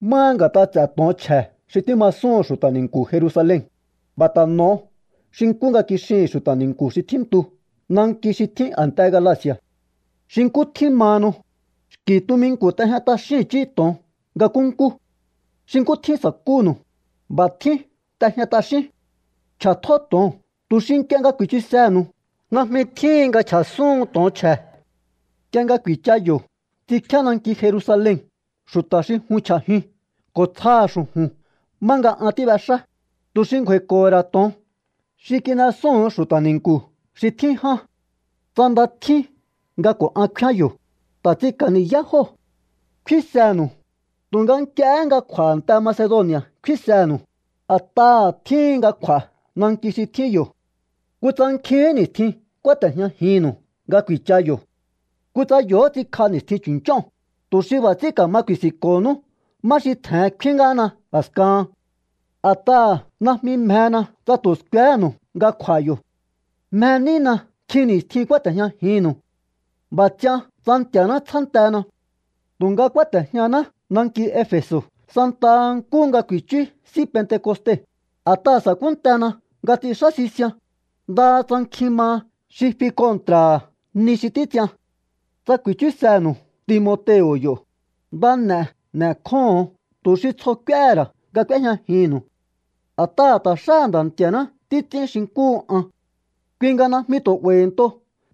Máha nga̱t'a ts'e̱ to̱on chje̱ xi tímasúhu̱n xu̱ta̱ ni̱nku̱ Jerusalen, b'a̱ ta̱ n'o̱o xi nkú nga kixihi̱n xu̱ta̱ ni̱nku̱ xi tjíntu nanki xi tjín a̱nte Galaci̱a̱. Xi nkú tjín mahanu, xki̱ tuminku̱ t'ejña t'axíún i̱chí to̱on nga nkúnkú. Xi nkú tjín sa̱kúnu̱u, b'a̱ tjín t'ejña t'axíún. Ch'a̱tjó to̱oo̱n tu̱ xi nk'ie nga ku̱i̱chusehe̱nu̱u najmi tjíhin nga chj'a̱súhun to̱on chje̱. Nk'ie nga ku̱i̱cha yo̱ ts'inkjíá nanki Jerusalen xu̱ta̱ xi jun chj'a̱jiun ko̱ tsjaha̱ xu̱ju̱n má nga an tíb'exá, tu̱ xi ngju̱a̱i̱ko̱ho̱ ra̱ to̱on xi kin'esúu̱n xu̱ta̱ ni̱nku̱ xi tjín ján. Tsa nda tjín nga ko̱ an kfíán yo̱, ta̱ ts'inka̱ ni̱yá jóo̱. Kfínsenu̱u, tu̱nga nk'iehé nga kj'u̱a̱ a̱nte Macedoni̱a̱ kfínsenu̱u, a̱t'aha̱ tjíhin nga kj'u̱a̱ nanki xi tjín yo̱. Kutsa nkjihín ni̱stjin kúáte̱jñajinnu̱u nga ku̱i̱cha yo̱. Kutsa yo̱hó ts'inkj'a ni̱stjin chu̱nch'óo̱n, tu̱ xi b'a̱ ts'ín ka̱ma ku̱i̱si̱nko̱honú má xi tje̱hen kfín ngáhana a̱skahan. A̱t'aha̱ najmi mjena tsa tu̱ skuehénu̱u nga kj'u̱a̱ yo̱. Mje nína nkjin ni̱stjin kúáte̱jñajinnu̱u. B'a̱ ts'ian tsa Nti̱a̱ná tsjántena. Tu̱nga kúáte̱jñaná nanki Efe̱so̱ santaha nkúhu nga ku̱i̱chú S'í Pentekoste, a̱t'aha̱ sa̱kúntena nga ts'inxá sisian, ndaha tsa nkjin maha xi fi kontra̱ha̱ ni xi títs'ian. Tsa ku̱i̱chúsenu̱u Timoteo̱ yo̱, nda n'e̱ n'e̱kjóho̱on tu̱ xi tsjo k'úéhe̱ ra̱ nga k'úéjñajinnu̱u. A̱t'aha̱ ta̱ xáha̱ Nda̱ Nti̱a̱ná títs'ín xi nkúhu an. Kui nga najmi tu̱ 'ba̱i̱nto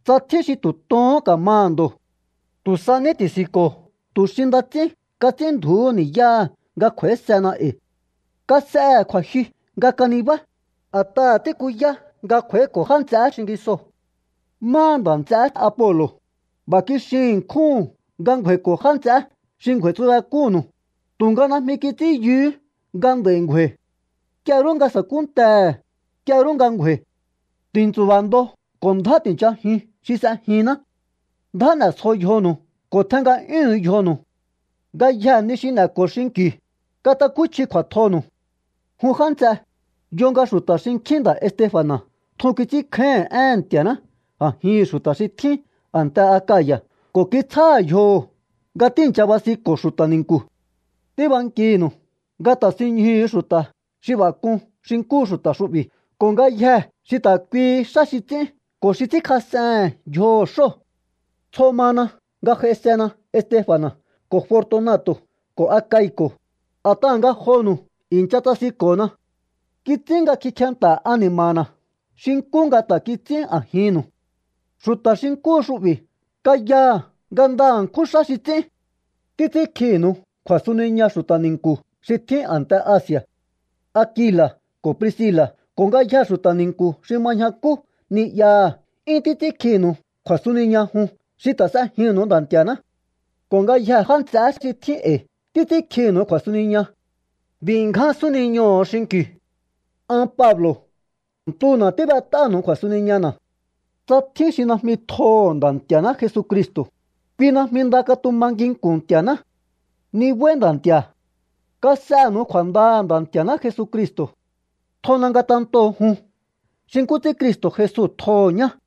tsa tjín xi tu̱ tohón ka̱maha̱ ndo̱. Tu̱ sa ní ti̱si̱nko̱o tu̱ xi nda ts'ín kats'ínndju̱úhu ni̱yáha̱ nga kj'u̱a̱ísehena e̱i. Kas'ehe̱ kju̱a̱jyu nga kanibá, a̱t'aha̱ tíkuyá nga kj'u̱a̱íko̱ já nts'eé xingisoo̱. Máha nda̱ nts'eé Apolo̱, b'a̱ kixin ṉkjúhu̱n nga ngju̱a̱i̱ko̱ já nts'eé xi ngju̱a̱i̱tsubek'únnu̱u, tu̱nga najmi kits'ín yuhú nga nd'a̱i̱ ngju̱a̱i̱. Nk'ie rú nga sa̱kúntehe̱, nk'ie rú nga ngju̱a̱i̱. Ti̱ntsu̱ba̱ ndo ko̱ ndjá ti̱nchajiun xi s'ejinná. Ndjá n'e̱sjo yjonu̱u ko̱ tjen nga'yúhu̱un yjonu̱u. Ngayjee̱ ni xi n'e̱ko̱o xinki̱u, katakúchji kju̱a̱tjonu̱u. Jun já nts'e, yo nga xu̱ta̱ xinkjín nda̱ Estefa̱na̱ tjun kits'ínkjáíhi̱n éhe̱n Nti̱a̱ná a̱jihi̱n xu̱ta̱ xi tjín a̱nte Akaya̱ ko̱ kitsjáha̱ yjoho̱ nga tíi̱ncha basinko̱ xu̱ta̱ ni̱nku̱. Tíbankinu̱u nga ta̱sinñjuhu̱u xu̱ta̱ xi b'a̱ k'un xi nkúhu xu̱ta̱ xu'bi̱ ko̱ ngayjee̱ xi ta̱ kuihi xá xi ts'ín ko̱ xi ts'ínkjas'ehe̱n yjoho̱ xóo̱. Tsjo mana nga j'aisena Estefa̱na̱ ko̱ Fortunato̱ ko̱ Akai̱ko̱, a̱t'aha̱ ngajonu̱u i̱ncha tsasinko̱na. Kits'ín nga kikjenta̱ ani̱ma̱na̱ xi nkú nga ta̱ kits'ín a̱jinnu̱u. Xu̱ta̱ xi nkúhu xu'bi̱ kayaha̱ nga nda ṉkjún xá xi ts'ín. Títs'ínkjinu̱u kju̱a̱suniña xu̱ta̱ ni̱nku̱ xi tjín a̱nte Asi̱a̱. Akila̱ ko̱ Priscila̱ ko̱ ngayjee̱ xu̱ta̱ ni̱nku̱ xi ma ñjakú ni'yaha̱ 'yún títs'ínkjinu̱u kju̱a̱suniña jun xi ta̱ s'ejinnu̱u Nda̱ Nti̱a̱ná. Ko̱ ngayjee̱ já nts'eé xi tjín e̱i̱ títs'ínkjinu̱u kju̱a̱suniña. B'i̱ ngján súniñoho̱o xinki̱u. An Pablo̱ ntuna̱ tíb'et'áha̱nu̱u kju̱a̱suniñana̱. Tsa tjín xi najmi tjoho̱ Nda̱ Nti̱a̱ná Jesucristo̱, kui najmi nda katuma nginku̱n Nti̱a̱ná. ¡Nibáí Nda̱ Nti̱a̱! Kas'enu̱u kju̱a̱ndaha̱ Nda̱ Nti̱a̱ná Jesucristo̱. Tjona ngatentoo̱ jun xi nkú ts'ín Cristo̱ Jesu tjoho̱ ñá.